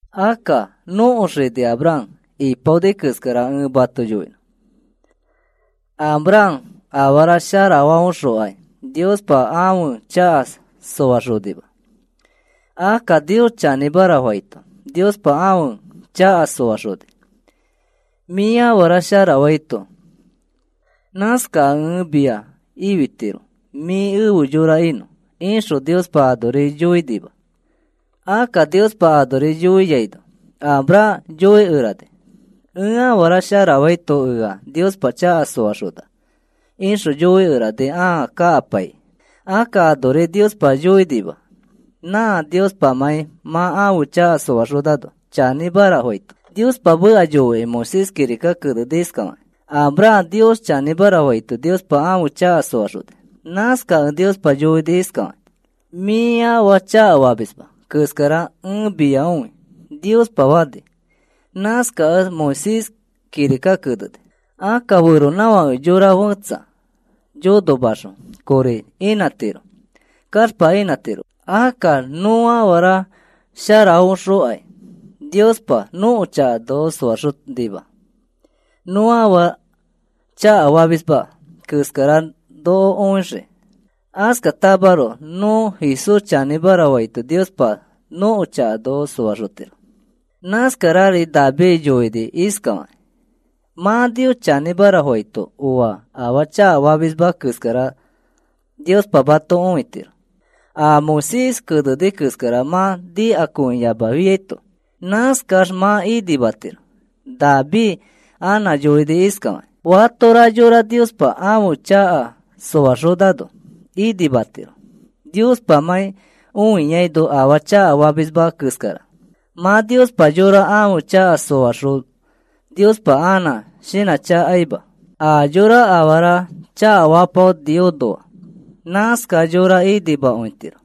Akka nõko xini Abraham ipaoni keskara ẽ mato yoinõ. Abraham afara sharafaõxokai Niospa ãfe chaka soaxonima. Akka Nios chanĩmara faito Niospa ãfe chaka soaxoni. “Mĩ afara sharafaito nãskakẽ ẽ mia ifitiro mĩ efe yora inõ,” ixõ Niospa anori yoinima. Akka Niospa anori yoiano Abraham yoikerani: “Ẽ afara sharafaito ea Niospa chaka soaxona,” ixõ yoikerani ãa kakapaikĩ. Akka anori Niospa yoinima, nã Niospamãi mã ãfe chaka soaxonano chanĩmara faito. Niospa meka yoikĩ Moisés kirika keneni iskafakĩ: “Abraham Nios chanĩmara faito Niospa ãfe chaka soaxoni. Nãskakẽ Niospa yoini iskafakĩ: ‘Mĩ afaa chakafamisma keskara ẽ mia õi,’ Niospa fani.” Nãskakẽ Moisés kirika keneni. Akka feronãfãke yora fetsa yonomaxõ kori inãtiro, kaxpa inãtiroma. Akka nõ afara sharafaõxokai Niospa nõko chaka noko soaxonima, nõ afaa chakafamisma keskara noko õixiki. Askatamaroko nõ Jesús chanĩmara faito Niospa nõko chaka noko soaxotiro. Nãskarari David yoini iskafakĩ: “Mã Nios chanĩmara faito oa afaa chakafamisma keskara Niospa mato õitiro a Moisés keneni keskara mã nikakõiyamafiaito. Nãskax mã inimatiro.” David anã yoini iskafakĩ: Fatora yora Niospa ãfe chaka soaxonano inimatiro Niospamãi õiaino afaa chakafamisma keskara. Mã Niospa yora ãfe chaka soaxõ Niospa anã shinãchakaima a yõra afara chakafapaoniõnoa. Nãskax yora inimakõitiro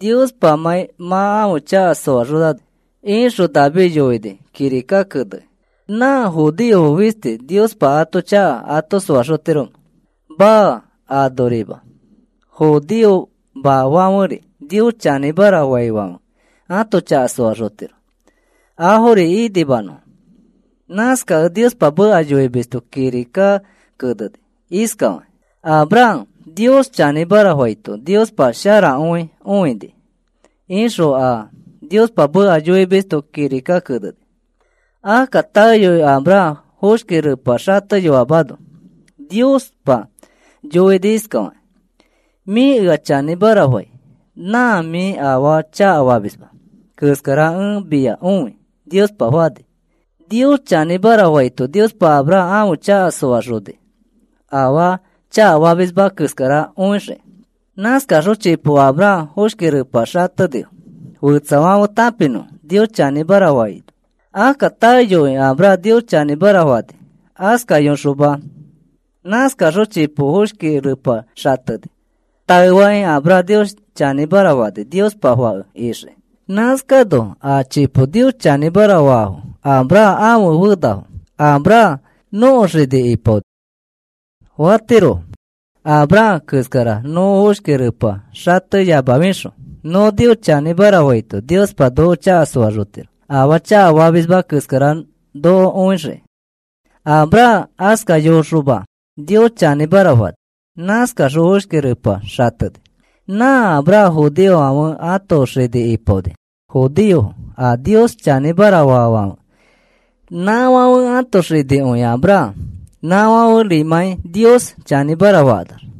Niospamãi mã ãfe chaka soaxonano, ixõ David yoini kirika kenekĩ. ¿Nã judeofo fisti Niospa ãto chaka ato soaxotiromẽ? Maa, anorima. Judeomafãferi Nios chanĩmara faifãfe ato chaka soaxotiro afori inimanõfo. Nãskakẽ Niospa meka yoimisto kirika keneni iskafakĩ: “Abraham Nios chanĩmara faito Niospa sharakõi õini,” ixõ a Niospa meka yoimisto kirika keneni. Akka taeyoi Abraham foshki repa xateyoamano Niospa yoini iskafakĩ: “Mĩ ea chanĩmara fai nã mĩ afaa chakafamisma keskara ẽ mia õi,” Niospa fani. Nios chanĩmara faito Niospa Abraham ãfe chaka soaxoni afaa chakafamisma keskara õixiki. Nãskaxõ chipo Abraham foshki repa xatenifo fetsafãfe tãpinõfo Nios chanĩmara faino. Akka taeyoi Abraham Nios chanĩmara fani askayoxoma. Nãskaxõ chipo foshki repa xateni. Taefakĩ Abraham Nios chanĩmara fani Niospa fake ixiki. Nãskano a chipo Nios chanĩmara faifo Abraham ãfe fenafo. “Abraham nõko xini ipaoni,” fatirofo. Abraham keskara nõ foshki repa xateyamafixõ nõ Nios chanĩmara faito Niospa noko chaka soaxotiro afaa chakafamisma keskara noko õixiki. Abraham askayoxoma Nios chanĩmara fani. Nãskaxõ foshki repa xateni. Nã Abraham judeofãfe ãto xini ipaoni. Judeofo a Nios chanĩmara faafãfe nãfãfe ãto xinikõi Abraham nafãferimãi Nios chanĩmara fakanax.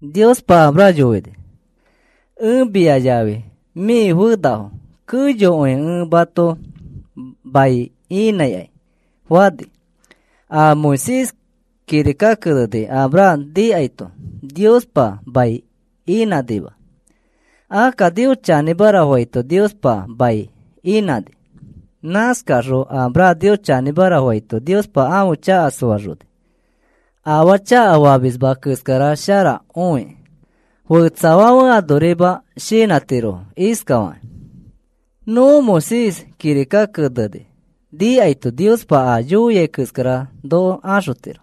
Niospa Abraham yoini: “Ẽ mia yafi mĩ fenafo keyokõi ẽ mato mai inãikai,” fani. A Moisés kirika keneni Abraham nikaito Niospa mai inãnima. Akka Nios chanĩmara faito Niospa mai inãni. Nãskaxõ Abraham Nios chanĩmara faito Niospa ãfe chaka soaxoni, afaa chakafamisma keskara shara õikĩ. Fetsafãfe anorima shinãtirofo iskafakakĩ: “Nõ Moisés kirika keneni nikaito Niospa a yoiai keskara noko axotiro.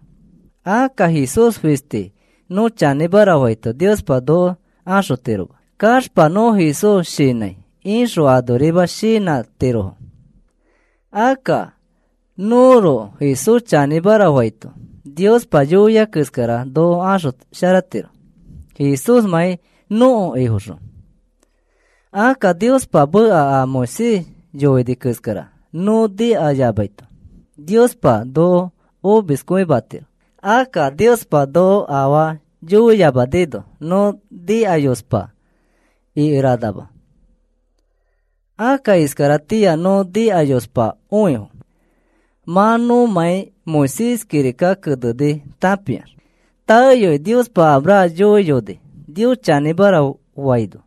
Akka Jesús fisti nõ chanĩmara faito Niospa noko axotiroma. Kaxpa nõ Jesús shinãi,” ixõ anorima shinãtirofo. Akka nõroko Jesús chanĩmara faito Niospa yoia keskara noko axosharatiro Jesúsmãi nõko Ifoxõ. Akka Niospa meka a Moisés yoini keskara nõ nikayamaito Niospa noko omiskõimatiro. Akka Niospa noko afaa yoiyamanino nõ nikayospa ikeranama. Akka iskaratĩa nõ nikayospakõifo mã nõmãi Moisés kirika keneni tãpiax. Taeyoi Niospa Abraham yoiyoni Nios chanĩmara faino.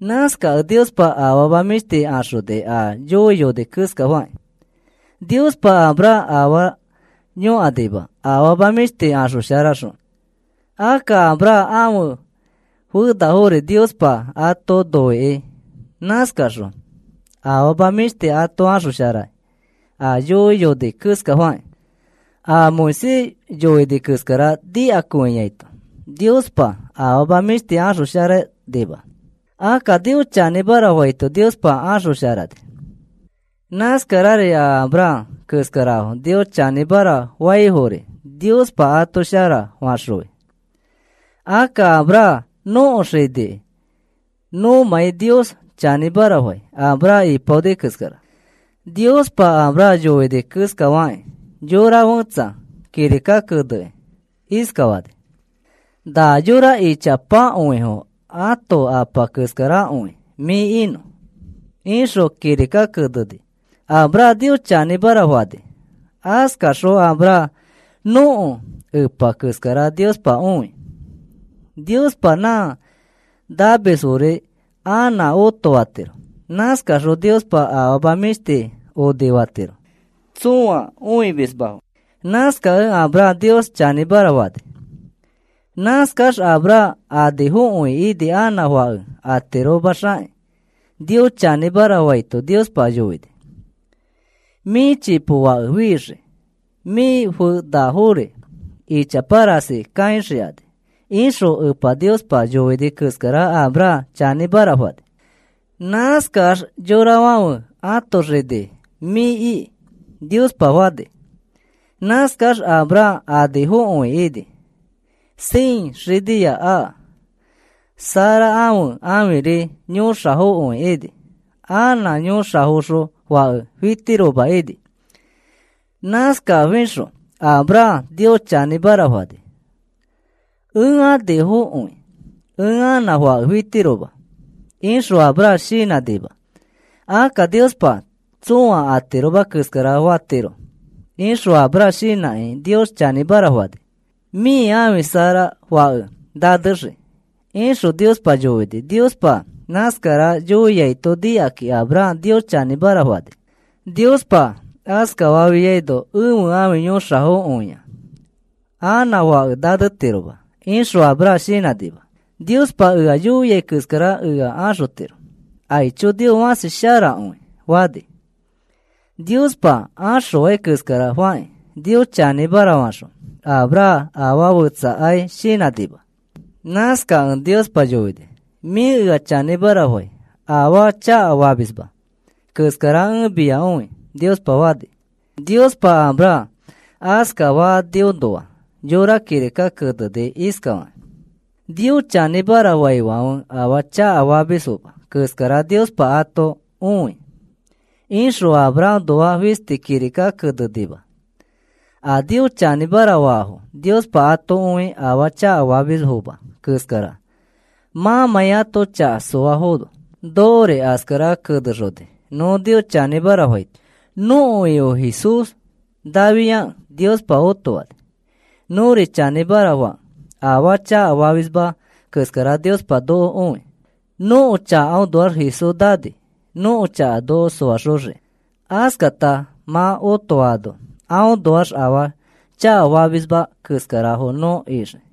Nãskakẽ Niospa afama mĩshti axoni a yoiyoni keskafakĩ. Niospa Abraham afaa yõkanima afama mĩshti axosharaxõ. Akka Abraham ãfe fenafori Niospa ato noikĩ nãskaxõ afama mĩshtiri ato axosharai a yoiyoni keskafakĩ. A Moisés yoini keskara nikakõiaito Niospa afama mĩshti axosharanima. Akka Nios chanĩmara faito Niospa axosharani. Nãskarari a Abraham keskarafo Nios chanĩmara faifori Niospa ato shara faxõi. Akka Abraham nõko xinikĩ nõmãi Nios chanĩmara fai Abraham ipaoni keskara. Niospa Abraham yoini keskafakĩ, yora fẽtsa kirika kenekĩ iskafani: “Nã yora ichapakõifo ãto apa keskarakõi mĩ inõ,” ixõ kirika keneni. Abraham Nios chanĩmara fani. Askaxõ Abraham nõko epa keskara Niospa õi. Niospa nã namisfori anã otofatiro. Nãskaxõ Niospa afama mĩshti onifatiro tsõa õimismafo. Nãskakẽ Abraham Nios chanĩmara fani. Nãskax Abraham anifokõi ini anã fake atiromaxakĩ. Nios chanĩmara faito Niospa yoini: “Mĩ chipo fake fixii. Mĩ fenafori ichapa rasi kaixikani,” ixõ Epa Niospa yoini keskara Abraham chanĩmara fani. Nãskax, “Yorafãfe ãto xini mĩ iki,” Niospa fani. Nãskax Abraham anifokõi ini. Cien xiniya aka. Sara ãfe ãfiri yõxafokõi ini. Anã yõxafoxõ fake fitiroma ini. Nãskafixõ Abraham Nios chanĩmara fani. “Ẽ anifokõi, ẽ anã fake fitiroma,” ixõ Abraham shinãnima. “Akka Niospa tsõa atiroma keskara fatiro,” ixõ Abraham shinãkĩ Nios chanĩmara fani. “Mĩ ãfi Sara fake nanexii,” ixõ Niospa yoini. Niospa nãskara yoiaito nikakĩ Abraham Nios chanĩmara fani. Niospa askafafiaino, “Ẽfe ãfi yõxafokõia. Anã fake nanetiroma,” ixõ Abraham shinãnima. “Niospa ea yoia keskara ea axotiro. Aicho, Nios fãsi sharakõi,” fani. Niospa axõai keskara fakĩ Nios chanĩmara faxõ Abraham afaa fetsakai shinãnima. Nãskakẽ Niospa yoini: “Mĩ ea chanĩmara fai afaa chakafamisma keskara ẽ mia õi,” Niospa fani. Niospa Abraham askafaniõnoa yõra kirika keneni iskafakĩ: “Nios chanĩmara faifãfe afaa chakafamisfoma keskara Niospa ato õi,” ixõ Abrahamnoa fisti kirika kenenima. A Nios chanĩmara faifo Niospa ato õi afaa chakafamisfoma keskara mãmãi ãto chaka soafono. Nokori askara kenexoni nõ Nios chanĩmara faito. “Nõko Ifo Jesús naafiakẽ Niospa otofani,” nõri chanĩmara fakẽ, afaa chakafamisma keskara Niospa noko õi. Nõko chakaõnoax Jesús nani nõko chaka noko soaxoxiki. Askata mã otofaano aõnoax afaa chakafamisma keskarafo nõ ixii.